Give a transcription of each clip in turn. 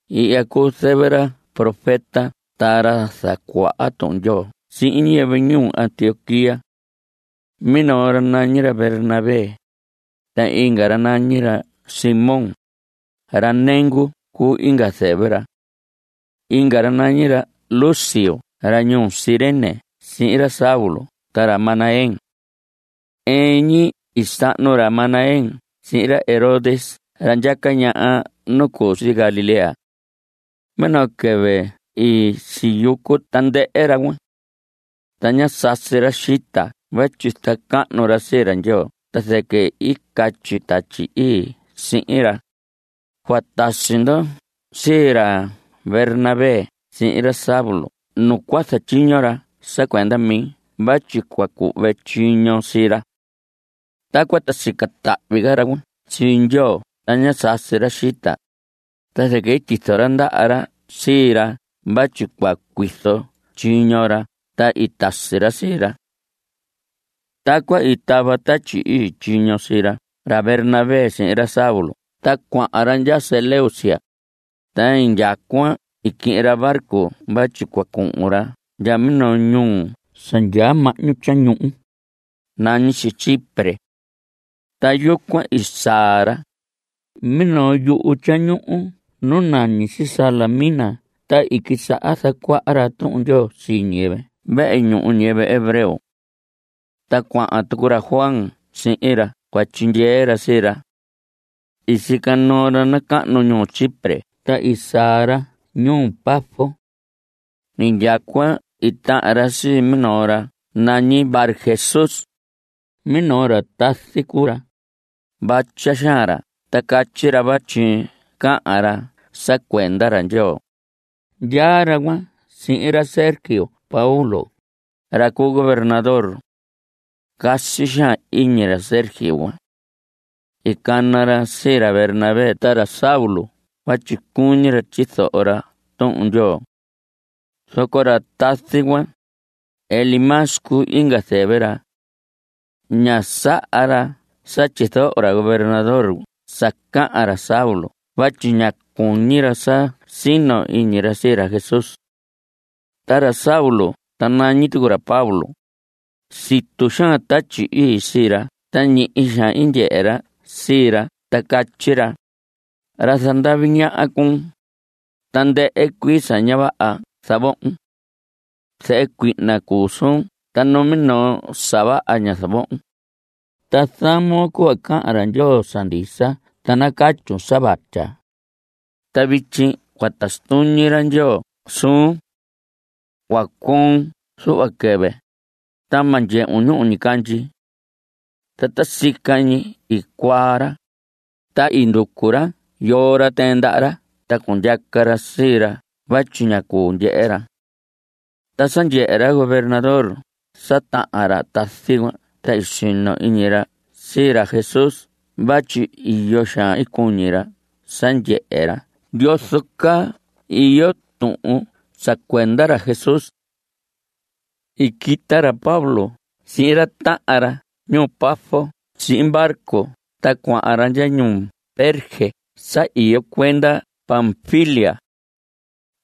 Ihya cuu zɨvɨ ra profeta ta ra zacuaha Tuhun Ndyoo sii ñiyɨvɨ ñuu Antioquía. Minoo ra nañi ra Bernabé, inga ra nañi ra Simón, ra nengu cuu inga zɨvɨ ra. Inga ra nañi ra Lucio ra ñuu Cirene sihin ra Saulo ta ra Manaén. Ɨɨn ñi i sahnu ra Manaén sihin ra Herodes ra ndyaca ñaha nu cu si Galilea. Minoo quɨvɨ i siyucu tandɨhɨ ra cuan. Ta ñá sasi ra xita vatyi zacahnu ra sii ra Ndyoo ta zɨquɨ i catyi Tatyi Ii sihin ra: Cua tasi ndo sii ra Bernabé sihin ra Saulo nu cua zatyiño ra sa cuenda mi vatyi cua cuhve tyiño sii ra. Tacuan ta i sica tahvi ca ra cuan sii Ndyoo ta ñá sasi ra xita, ta zɨquɨ i tyizo ra ndaha ra sii ra vatyi cua cuizo tyiño ra ta i tasi ra sii ra. Tacuan i tava Tatyi Ii tyiño sii ra Bernabé sihin ra Saulo ta cuahan ra ndya Seleucia, ta indyacuan i quihin ra barco vatyi cua cuhun ra ndya minoo ñuhu sa ndyaa mahñu tyañuhu, nañi si Chipre. Ta yucuan i saa ra, minoo yuhu tyañuhu nu nañi si Salamina ta i quisaha zacuaha ra Tuhun Ndyoo sii ñiyɨvɨ vehe ñuhu ñiyɨvɨ hebreo. Ta cuahan tucu ra Juan sihin ra cua tyindyee ra sii ra. I sica noo ra nacahnu ñuhu Chipre ta i saa ra ñuu Pafos. Indyacuan i tahan ra sii minoo ra nañi Barjesús. Minoo ra tazi cuu ra. Vatya xaan ra ta catyi ra vatyi cahan ra sa cuenda ra Ndyoo. Ndyaa ra cuan sihin ra Sergio Paulo, ra cu gobernador. Casi xaan iñi ra Sergio cuan. I cana ra sii ra Bernabé ta ra Saulo vatyi cuñi ra tyizoho ra Tuhun Ndyoo. Zoco ra tazi cuan, Elimas cuu inga zɨvɨ ra. Ñá saha ra sa tyizoho ra gobernador sa cahan ra Saulo vatyi ñá cuñi ra sa cua sino iñi ra sii ra Jesús. Ta ra Saulo, ta nañi tucu ra Pablo, situ xaan Tatyi Ii sii ra ta ñihi xaan i ndyehe ra sii ra ta catyi ra: Ra zandavi ñaha cuun. Tandɨhɨ cuii sa ña vaha zavohon. Zehe cuihna cuu suun ta numinoo sa vaha ña zavohon. Ta zamon cuhva cahan ra Ndyoo sa ndisa ta nacatyun sa vatya. Ta vityi cua tasi tuñi ra Ndyoo suun. Cua cuoon zuhva quɨvɨ, ta ma ndyehun ñuhu ñicandyi. Ta ta sica ñi i cuaa ra. Ta i nducu ra yoo ra tɨɨn ndaha ra ta cundyaca ra sii ra vatyi ña cuu ndyehe ra. Ta sa ndyehe ra gobernador sa tahan ra tazi cuan ta i sino iñi ra sii ra Jesús vatyi iyo xaan i cuñi ra sa ndyehe ra yozo caa iyo tuhun sa cuenda ra Jesús. I quita ra Pablo sihin ra tahan ra ñuu Pafos sihin barco ta cuahan ra ndya ñuu Perge sa iyo cuenda Panfilia.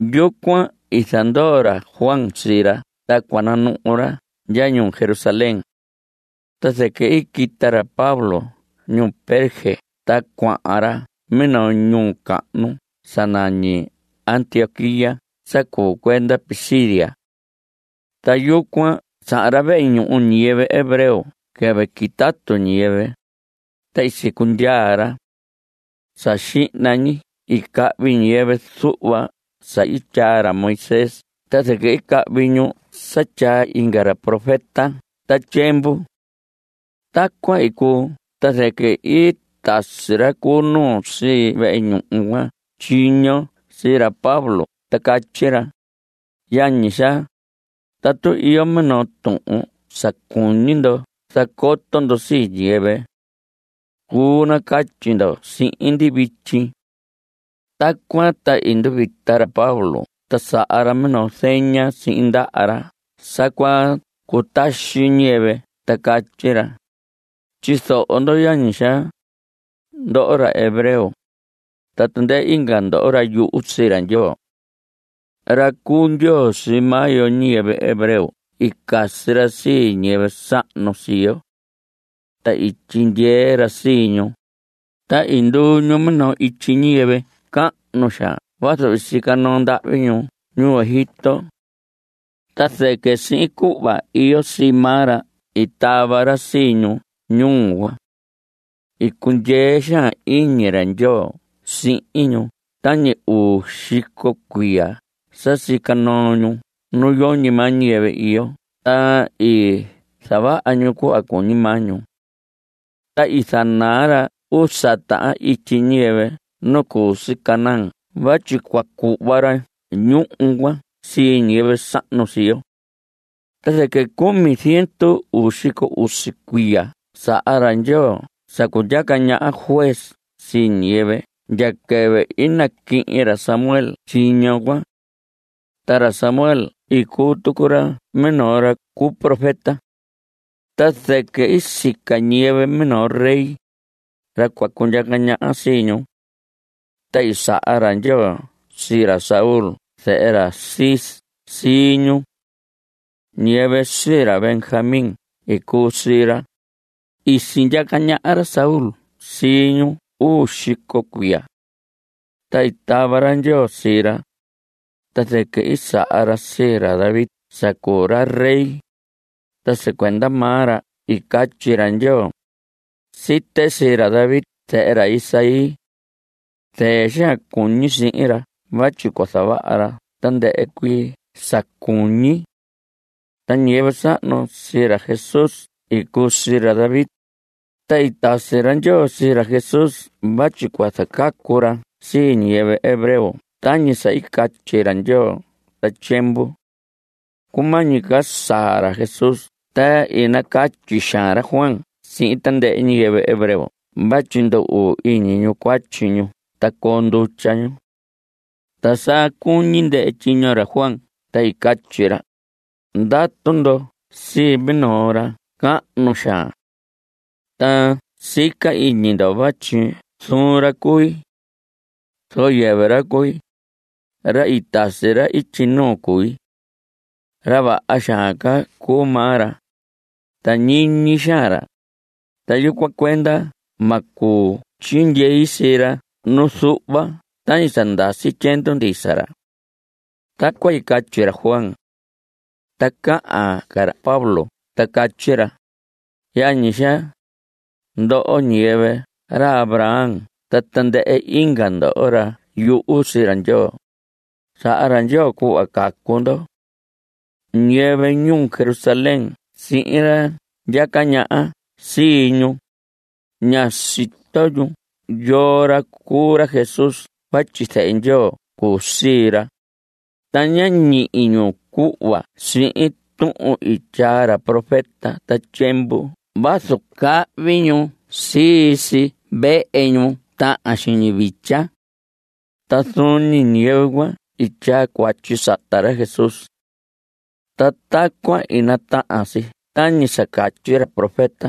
Yucuan i zandoo ra Juan sii ra ta cua nanuhu ra ndya ñuu Jerusalén. Ta zɨquɨ i quita ra Pablo ñuu Perge ta cuahan ra minoo ñuu cahnu sa nañi Antioquía sa cuu cuenda Pisidia. Ta yucuan sahan ra vehe ñuhu ñiyɨvɨ hebreo quɨvɨ quitatu ñiyɨvɨ, ta i sicundyaa ra. Sa xihna ñi i cahvi ñiyɨvɨ zuhva sa i tyaa ra Moisés ta zɨquɨ i cahvi ñu sa tyaa inga ra profeta ta tyiemvu. Tacuan i cuu ta zɨquɨ i tasi ra cu nuu sii vehe ñuhu cuan tyiño sii ra Pablo ta catyi ra: Yañi xaa, tatu iyo minoo tuhun sa cuñi ndo zacoto ndo sii ñiyɨvɨ. Cuu nacatyi ndo sihin ndi vityi. Tacuan ta i nduvita ra Pablo ta saha ra minoo zeña sihin ndaha ra sa cua cutaxi ñiyɨvɨ ta catyi ra: Tyizoho ndo yañi xaa, ndoho ra hebreo, ta tandɨhɨ inga ndoho, ra yuhu sii ra Ndyoo. Ra cu Ndyoo sii maa yo ñiyɨvɨ hebreo i casi ra sii ñiyɨvɨ sahnu sii yo. Ta i tyindyee ra sii ñu, ta i nduu ñu minoo ityi ñiyɨvɨ cahnu xaan vazu i sica noo ndahvi ñu ñuu Egipto. Ta zɨquɨ sihin cuhva iyo sii maa ra i tava ra sii ñu ñuu cuan. I cundyee xaan iñi ra Ndyoo sihin ñu tañi uu xico cuiya sa sica noo ñu nu yoñi maa ñiyɨvɨ iyo ta i zavaha ñu cuhva cuñi maa ñu. Ta i zanaa ra usa tahan ityi ñiyɨvɨ nu cu si Canaán vatyi cua cuhva ra ñuhu cuan sii ñiyɨvɨ sahnu sii yo. Ta zɨquɨ cumi ziendu uu xico usi cuiya saha ra Ndyoo sa cundyaca ñaha juez sii ñiyɨvɨ ndya quɨvɨ i naquihin ra Samuel tyiño cuan. Ta ra Samuel i cuu tucu ra minoo ra cu profeta. Ta zɨquɨ i sica ñiyɨvɨ minoo rey, ra cua cundyaca ñaha sii ñu. Ta i saha ra Ndyoo sii ra Saúl zehe ra Cis sii ñu. Ñiyɨvɨ sii ra Benjamín i cuu sii ra. I sindyaca ñaha ra Saúl sii ñu uu xico cuiya. Ta i tava ra Ndyoo sii ra. Ta zɨquɨ i saha ra sii ra David sa cuu ra rey, ta sa cuenda maa ra i catyi ra Ndyoo: “Site sii ra David zehe ra Isaí. Zɨɨ xaan cuñi sihin ra vatyi cua zavaha ra tandɨhɨ cuii sa cuñi.” Ta ñiyɨvɨ sahnu sii ra Jesús i cuu sii ra David. Ta i tasi ra Ndyoo sii ra Jesús vatyi cua zacacu ra sii ñiyɨvɨ hebreo tañi sa i catyi ra Ndyoo ta tyiemvu. Cumañi ca saa ra Jesús ta i nacatyi xaan ra Juan sihin tandɨhɨ ñiyɨvɨ hebreo vatyi ndu‑uu iñi ñu cuatyi ñu ta coo ndutya ñu. Ta sa cuñi ndɨhɨ tyiño ra Juan ta i catyi ra: “Ndatu ndo sii minoo ra cahnu xaan. Ta sica iñi ndo vatyi zuun ra cui. Zoco yɨvɨ ra cui. Ra i tasi ra ityi nuu cui. Ra vaha xaan ca cuu maa ra, ta ñiñi xaan ra, ta yucuan cuenda ma cuu tyindyei sii ra nu zuhva tañi sa ndasi tyiendu ndisa ra.” Tacuan i catyi ra Juan. Ta cahan ca ra Pablo ta catyi ra: Yañi xaa, ndoho ñiyɨvɨ ra Abraham ta tandɨhɨ inga ndo, ra yuhu sii ra Ndyoo. Saha ra Ndyoo cuhva cacu ndo. Ñiyɨvɨ ñuu Jerusalén sihin ra ndyaca ñaha sii ñu, ñá sito ñu yoo ra cuu ra Jesús vatyi zehe Ndyoo cuu sii ra, ta ñá ñihi ñu cuhva sihin tuhun i tyaa ra profeta ta tyiemvu vazu cahvi ñu sii si vehe ñuhu ñu tahan xiñi vitya. Ta zuun ñi ñiyɨvɨ cuan i tyaa cuatyi sata ra Jesús. Ta tacuan i natahan si tañi sa catyi ra profeta.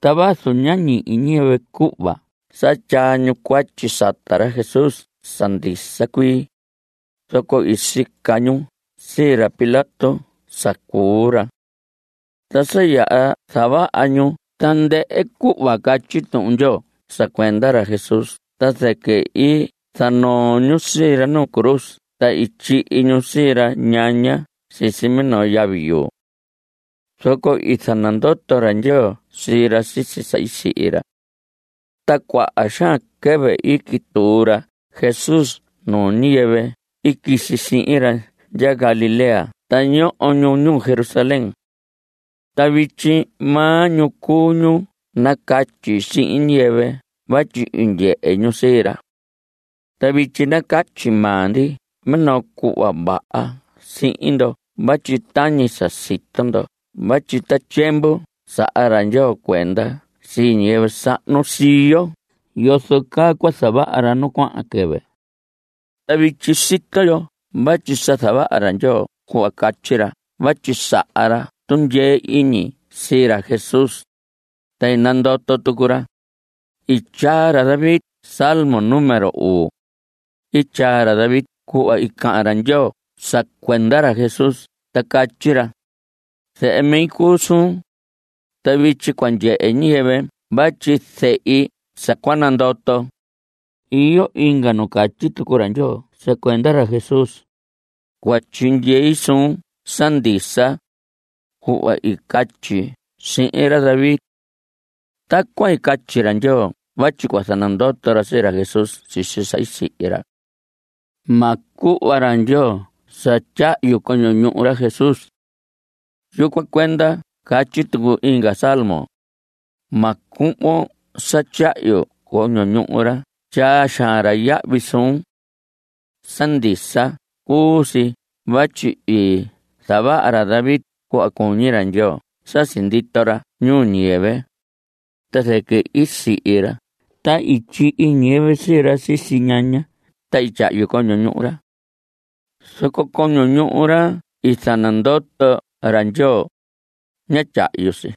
Ta vazu ñá ñihi ñiyɨvɨ cuhva sa tyaa ñu cuatyi sata ra Jesús sa ndisa cuii, zoco i sica ñu sii ra Pilato sa cuu ra. Ta sa yaha zavaha ñu tandɨhɨ cuhva catyi Tuhun Ndyoo sa cuenda ra Jesús ta zɨquɨ i zanoo ñu sii ra nuu cruz ta tyihi ñu sii ra ñaña sisi minoo yavi yuu. Zoco i zanandoto ra Ndyoo sii ra sisi sa i sihi ra. Ta cuaha xaan quɨvɨ i quituu ra Jesús nuu ñiyɨvɨ i quisi sihin ra ndya Galilea ta ñoho ñu ñuu Jerusalén. Ta vityi maa ñu cu ñu nacatyi sihin ñiyɨvɨ vatyi i ndyehe ñu sii ra. Ta vityi nacatyi maa ndi minoo cuhva vaha sihin ndo vatyi tañi sa sito ndo vatyi ta tyiemvu saha ra Ndyoo cuenda sii ñiyɨvɨ sahnu sii yo yozo caa cua zavaha ra nu cuahan quɨvɨ. Ta vityi sito yo vatyi sa zavaha ra Ndyoo cuhva catyi ra vatyi saha ra tundyee iñi sii ra Jesús, ta i nandoto tucu ra. I tyaa ra David salmo número uu. I tyaa ra David cuhva i cahan ra Ndyoo sa cuenda ra Jesús ta catyi ra: “Zehe mi cuu suun, ta vityi cua ndyehe ñiyɨvɨ vatyi sehi sa cua nandoton.” Iyo inga nu catyi tucu ra Ndyoo sa cuenda ra Jesús: “Cua tyindyei suun sa ndisa, cuhva i catyi sihin ra David.” Tacuan i catyi ra Ndyoo vatyi cua zanandoto ra sii ra Jesús sisi sa i sihi ra. Ma cuhva ra Ndyoo sa tyahyu coño ñuhu ra Jesús. Yucuan cuenda catyi tucu inga salmo: “Ma cuhvon sa tyahyu coño ñuhu ra tyaa xaan yahvi suun.” Sa ndisa cuu si vatyi i zavaha ra David cuhva cuñi ra Ndyoo sa sindito ra ñuu ñiyɨvɨ, ta zɨquɨ i sihi ra ta i tyihi ñiyɨvɨ sii ra sisi ñaña ta i tyahyu coño ñuhu ra. Zoco coño ñuhu ra i zanandoto ra Ndyoo, ña tyahyu si.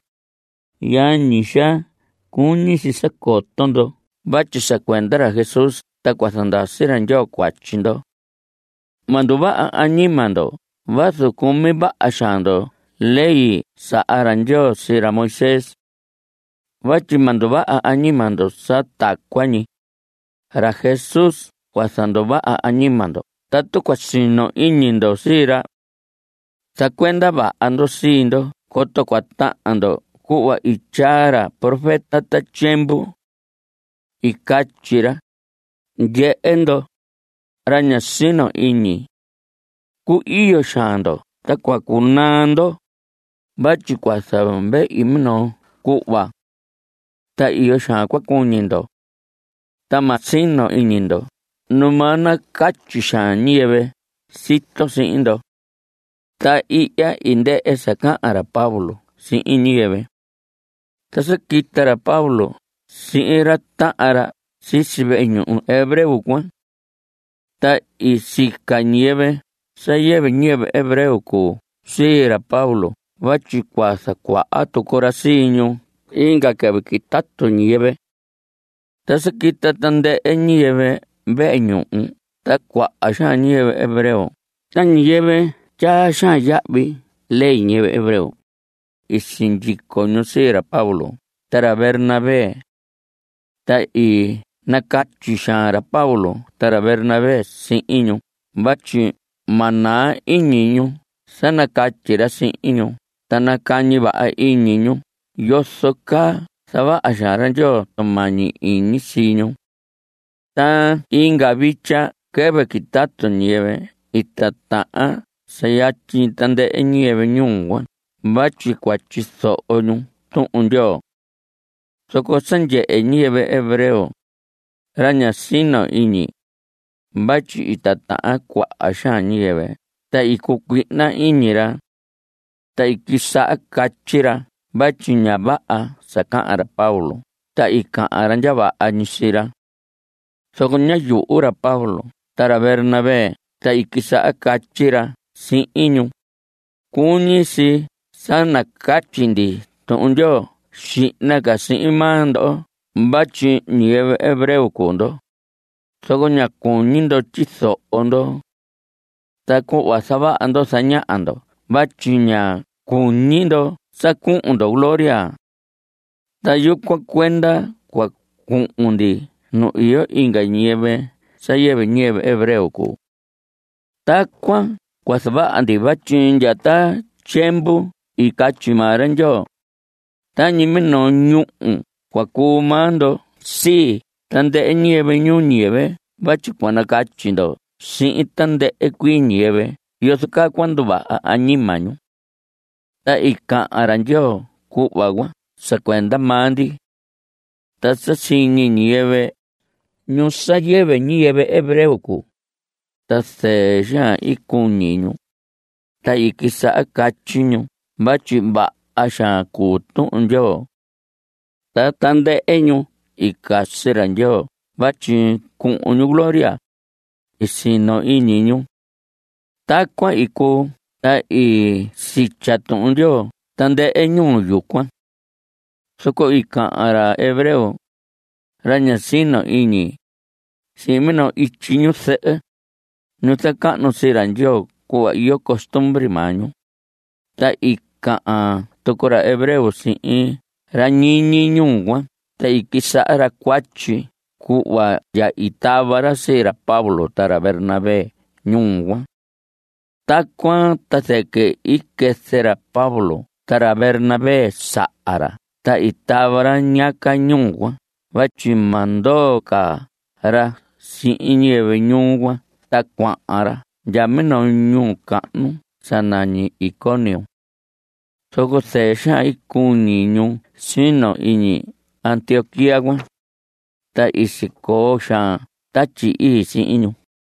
Yañi xaa, cuñi si sa coto ndo vatyi sa cuenda ra Jesús ta cua zandasi ra Ndyoo cuatyi ndo. Ma nduvaha añima ndo vazu cumi vaha xaan ndo ley i saha ra Ndyoo sii ra Moisés. Vatyi ma nduvaha añima ndo sa tacuan ñi. Ra Jesús cua zanduvaha añima ndo tatu cua sino iñi ndo sii ra. Zacuenda vaha ndo sii ndo coto cua tahan ndo cuhva i tyaa ra profeta ta tyiemvu. I catyi ra: Ndyehe ndoho, ra ña sino iñi. Cu‑iyo xaan ndo ta cua cunaa ndo. Vatyi cua zavehi minoo cuhva. Ta iyo xaan cua cuñi ndo. Ta ma sino iñi ndo Numaa nacatyi xaan ñiyɨvɨ sito sihin ndo. Ta ihya i ndɨhɨ sa cahan ra Pablo sihin ñiyɨvɨ. Ta sa quita ra Pablo sihin ra tahan ra sisi vehe ñuhu hebreo cuan. Ta i sica ñiyɨvɨ sa yɨvɨ ñiyɨvɨ hebreo cuu sii ra Pablo vatyi cua zacuaha tucu ra sii ñu inga quɨvɨ quitatu ñiyɨvɨ. Ta sa quita tandɨhɨ ñiyɨvɨ vehe ñuhu ta cuaha xaan ñiyɨvɨ hebreo ta ñiyɨvɨ tyaa xaan yahvi ley ñiyɨvɨ hebreo, i sindyico ñu sii ra Pablo ta ra Bernabé. Ta i nacatyi xaan ra Pablo ta ra Bernabé sihin ñu vatyi ma naa iñi ñu sa nacatyi ra sihin ñu ta nacañi vaha iñi ñu yozo caa zavaha xaan ra Ndyoo tumañi iñi sii ñu. Ta inga vitya quɨvɨ quitatu ñiyɨvɨ i titahan sa yatyi tandɨhɨ ñiyɨvɨ ñuu cuan vatyi cua tyizoho ñu Tuhun Ndyoo. Zoco sa ndyehe ñiyɨvɨ hebreo, ra ña sino iñi, vatyi i titahan cuaha xaan ñiyɨvɨ ta i cucuihna iñi ra. Ta i quisaha catyi ra vatyi ña vaha sa cahan ra Pablo ta i cahan ra ndya vaha ñi sii ra. Zoco ñá yuhu ra Pablo ta ra Bernabé ta i quisaha catyi ra sihin ñu: Cuñi si sa nacatyi ndi Tuhun Ndyoo xihna ca sihin maa ndo vatyi ñiyɨvɨ hebreo cuu ndo, zoco ña cuñi ndo tyizoho ndo. Ta cuhva zavaha ndo zañaha ndo vatyi ña cuñi ndo sa cuhun ndo gloria. Ta yucuan cuenda cua cuhun ndi nu iyo inga ñiyɨvɨ sa yɨvɨ ñiyɨvɨ hebreo cuu. Tacuan cua zavaha ndi vatyi ndya ta tyiemvu i catyi maa ra Ndyoo: “Tañi minoo ñúhu cua cuu maa ndo sii tandɨhɨ ñiyɨvɨ ñuu ñiyɨvɨ vatyi cua nacatyi ndo sihin tandɨhɨ cuii ñiyɨvɨ yozo caa cua nduvaha añima ñu.” Ta i cahan ra Ndyoo cuhva cuan sa cuenda maa ndi. Ta sa siñi ñiyɨvɨ, ñu sa yɨvɨ ñiyɨvɨ hebreo cuu, ta zɨɨ xaan i cuñi ñu, ta i quisaha catyi ñu vatyi vaha xaan cuu Tuhun Ndyoo. Ta tandɨhɨ ñu i casi ra Ndyoo vatyi cuhun ñu gloria, i sino iñi ñu. Tacuan i cuu ta i sitya Tuhun Ndyoo tandɨhɨ ñuu yucuan. Zoco i cahan ra hebreo, ra ña sino iñi, sihin minoo ityi ñu zɨhɨ, ñu zacahnu sii ra Ndyoo cuhva iyo costumbre maa ñu, ta i cahan tucu ra hebreo sihin ra ñiñi ñuu cuan ta i quisaha ra cuatyi cuhva ndya i tava ra sii ra Pablo ta ra Bernabé ñuu cuan. Tacuan ta zɨquɨ i quɨzɨ ra Pablo ta ra Bernabé saha ra ta i tava ra ñiyaca ñuu cuan vatyi ma ndoo ca ra sihin ñiyɨvɨ ñuu cuan ta cuahan ra ndya minoo ñuu cahnu sa nañi Iconio. Zoco zɨɨ xaan i cuñi ñu sino iñi ñuu Antioquía cuan, ta i sicoo xaan Tatyi Ii sihin ñu.